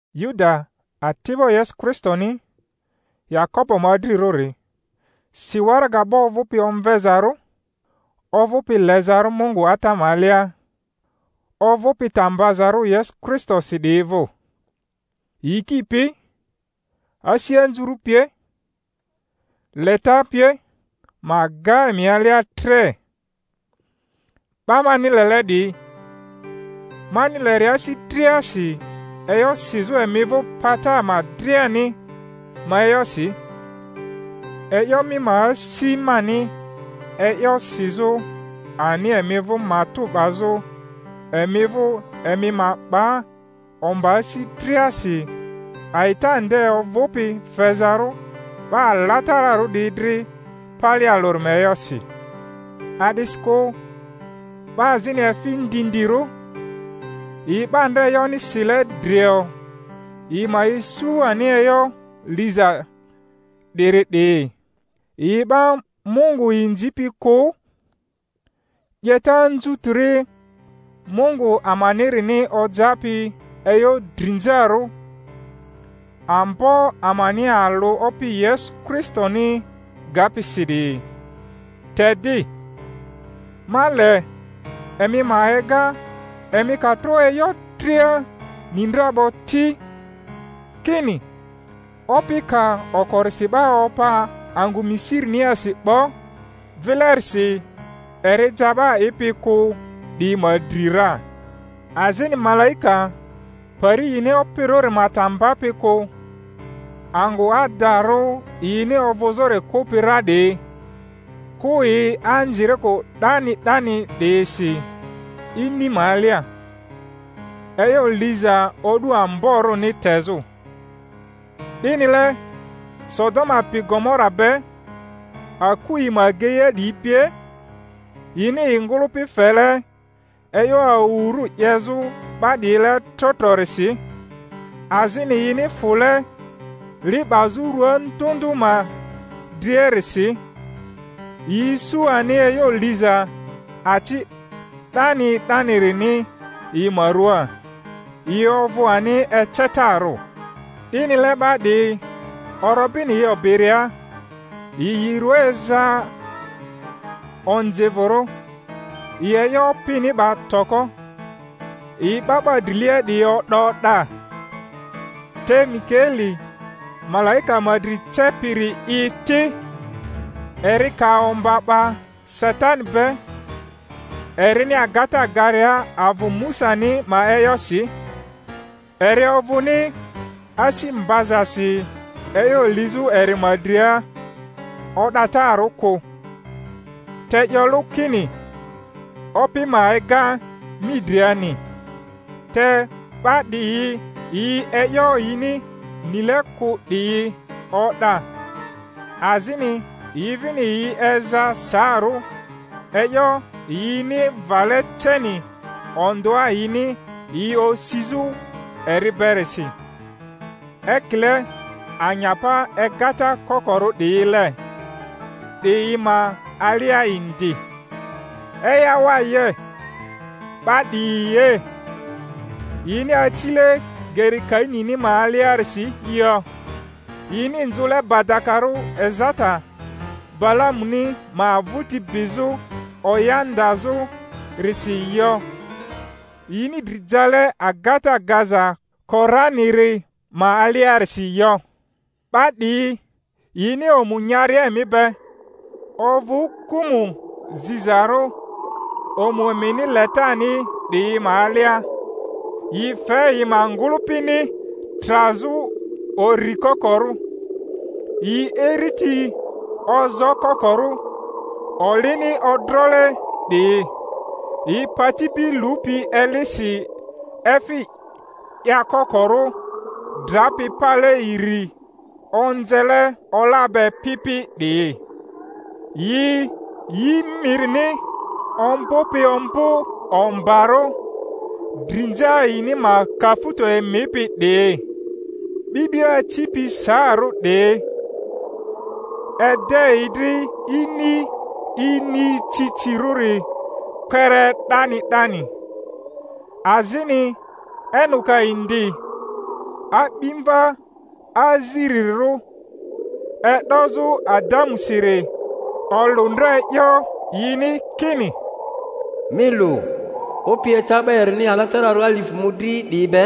Yuda, ati'bo Yesu Kristoni, Yakobo ma adrirᴜri, si waraga 'Ba ovᴜpi omvezarᴜ, ovᴜpi lezarᴜ Mungu Ata ma alia, ovᴜpi ta mbazarᴜ Yesu Kristosi 'diyi vᴜ: Yiki pi, asi anzurᴜ pie, leta pie ma ga emi alia tre. 'Ba mani lele 'diyi, mani leria asi driasi e'yo sizᴜ emi vᴜ pata ama driani ma e'yosi, e'yo mi ma asi mani e'yo sizᴜ ani emi vᴜ matᴜ 'bazᴜ emi vᴜ emi ma 'ba omba asi driasi a'ita nde ovᴜpi fezarᴜ 'ba alatararᴜ 'diyi dri pale alᴜri ma e'yosi. A'disikᴜ 'ba azini efi ndindirᴜ, yi 'ba ndra e'yoni sile drio yi ma isu ani e'yo liza 'diri 'diyi, yi 'ba Mungu inzipi kᴜ, 'yeta anzutiri Mungu amanirini ojapi e'yo drinzarᴜ, Ambo amani alᴜ Opi Yesu Kristoni gapi si 'diyi. Te di, ma le emi ma ega, emi ka tro e'yo dria ni ndra 'bo ti, kini Opi ka okorisi 'ba opa angᴜ Misiriniasi 'bo, vilerisi eri ja 'ba a'ipi kᴜ 'diyi ma dri ra. Azini malaika pari yini opirᴜri ma ta mbapi kᴜ, angᴜ adarᴜ yini ovᴜzᴜri kᴜpi ra 'diyi, kᴜ yi anzirikᴜ 'dani 'dani 'diyisi ini ma alia, e'yo liza o'du amborᴜni tezᴜ. 'Dinile Sodoma pi Gomora be, aku yi ma ageia 'diyi pie, yini yi ngᴜlᴜpi fele e'yo awurᴜ 'yezᴜ 'ba 'diyile tro trorisi, azini yini fule li 'bazᴜ rua ndᴜ ndᴜ ma driarisi, yi isu ani e'yo liza aci 'dani 'danirini yi ma ruaa, yi ovᴜ ani ecetarᴜ. 'Dinile 'ba 'diyi, orobini yi obiria, yi yi rua eza onzivᴜrᴜ, yi e'yo opini 'ba toko, yi 'ba 'ba drilia 'diyi o'da o'da. Te Mikaeli malaika ma dri cepiri'i ti, eri ka omba 'ba Satani be, erini agata garia avᴜ Musani ma e'yosi, eri ovᴜni asi mbazasi e'yo lizᴜ eri ma dria o'datarᴜ kᴜ, te 'yo lᴜ kini, Opi ma ega mi driani. Te 'ba 'diyi yi e'yo yini nile kᴜ 'diyi o'da, azini yi vini yi eza saarᴜ e'yo yini vale ceni ondᴜa yini yi osizᴜ eri berisi ekile anyapa egata kokorᴜ 'diyile 'diyi ma alia indi. Eyawaye, 'ba 'diyi ye! yini acile geri Kainini ma aliarisi yo! yini nzᴜle badakarᴜ ezata Balamuni ma vᴜti bizᴜ oya ndazᴜrisi yo! yini dri jale agata gaza Koraniri ma aliarisi yo! 'Ba 'diyi yini omu nyaria emi be, ovᴜ kᴜmᴜ zizarᴜ omu emini letani 'diyi ma alia, yi fe yi ma ngᴜlᴜpini trazᴜ uri kokorᴜ; yi iriti ozoo kokorᴜ, olini odrole 'diyi; yi pati bi lupi elisi efi 'yakokorᴜ, drapi pale iri, onzele ola be pi pi 'diyi; yi yi mirini ombᴜpi ombᴜ ombarᴜ, drinza yini ma kafuto emipi 'diyi; 'bi'bio acipi saarᴜ 'diyi, ede yi dri ini inicicirᴜri kpere 'dani 'dani. Azini Enoka indi, a'bimva azirirᴜ e'dozᴜ Adamusiri, olᴜ ndra e'yo yini kini, Mi lu, Opi eca 'ba erini alatararᴜ alifᴜ mᴜdri 'diyi be,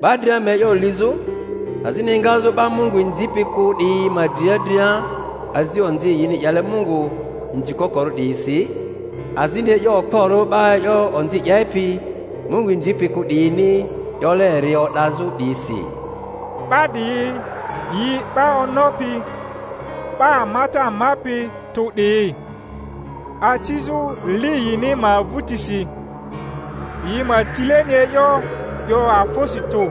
'ba dria ma e'yo lizᴜ, azini egazᴜ 'ba Mungu inzipi kᴜ 'diyi ma dria dria azi onzi yini 'yele Mungu inzikokorᴜ 'diyisi, azini e'yo okporᴜ 'ba e'yo onzi 'yepi Mungu inzipi kᴜ 'diyini 'yole eri o'dazᴜ 'diyisi. 'Ba 'diyi yi 'ba onopi, 'ba amata amapi tᴜ 'diyi, acizᴜ li yini ma vᴜtisi, yi ma tileni e'yo 'yo afᴜsi tᴜ,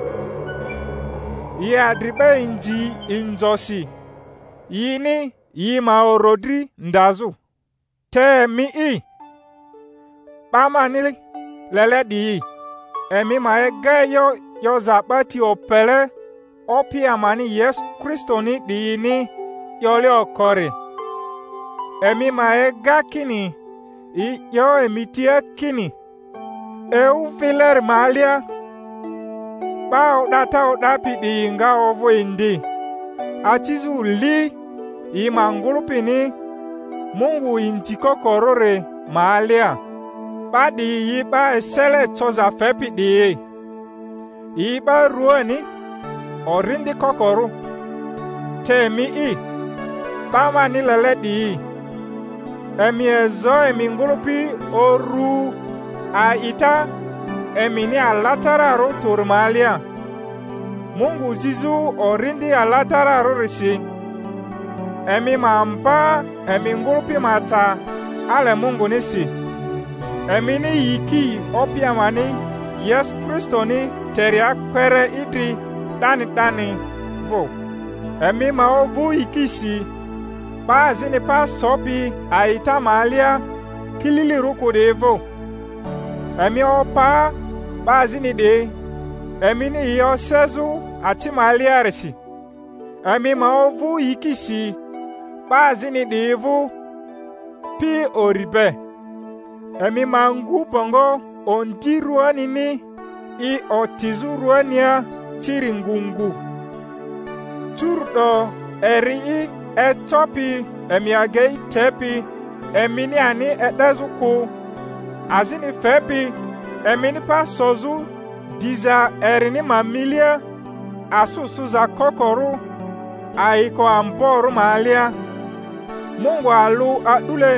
yi adri 'ba inzi inzosi yini yi ma orodri ndazᴜ. Te emi'i, 'ba mani lele 'diyi, emi ma ega e'yo 'yoza 'ba ti opele Opi amani Yesu Kristoni 'diyini 'yole okori; emi ma ega kini yi 'yo emi tia kini, Ewu vileri ma alia 'ba o'data o'dapi 'diyi nga ovᴜ indi, acizᴜ li yi ma ngᴜlᴜpini Mungu inzikokorᴜri ma alia. 'Ba 'diyi yi 'ba esele coza fepi 'diyi, yi 'ba ruani, Orindi kokorᴜ. Te emi'i, 'ba mani lele 'diyi, emi ezo emi ngᴜlᴜpi uru a'ita emini alatararᴜ tᴜri ma alia, Mungu zizᴜ Orindi Alatararᴜrisi; emi ma mba emi ngᴜlᴜpi ma ta ale Mungunisi, emini yiki Opi amani Yesu Kristoni teria kpere idri 'dani 'dani vᴜ. Emi ma ovᴜ yikisi 'ba azini pa sopi a'ita ma alia kililirᴜ kᴜ 'diyi vᴜ; emi opa 'ba azini 'diyi, emini yi osezᴜ aci ma aliarisi; emi ma ovᴜ yikisi 'ba azini 'diyi vᴜ pi uri be; emi ma ngu bongo ondi ruanini i otizᴜ ruania ciri ngu ngu. Curu'do eri'i ecopi emi agei tepi emini ani e'dezᴜ kᴜ, azini fepi emini pa sozᴜ diza erini ma milia asᴜ sᴜza kokorᴜ ayiko amborᴜ ma alia, Mungu alᴜ a'dule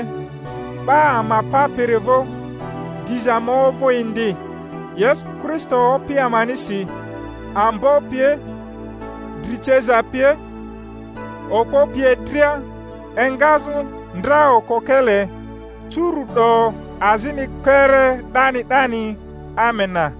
'Ba ama Papiri vᴜ, diza ma ovᴜ indi, Yesu Kristo Opi amanisi, ambo pie, dri ceza pie, okpo pie dria, engazᴜ ndra okokele, curu'do, azini kpere 'dani 'dani. Amena.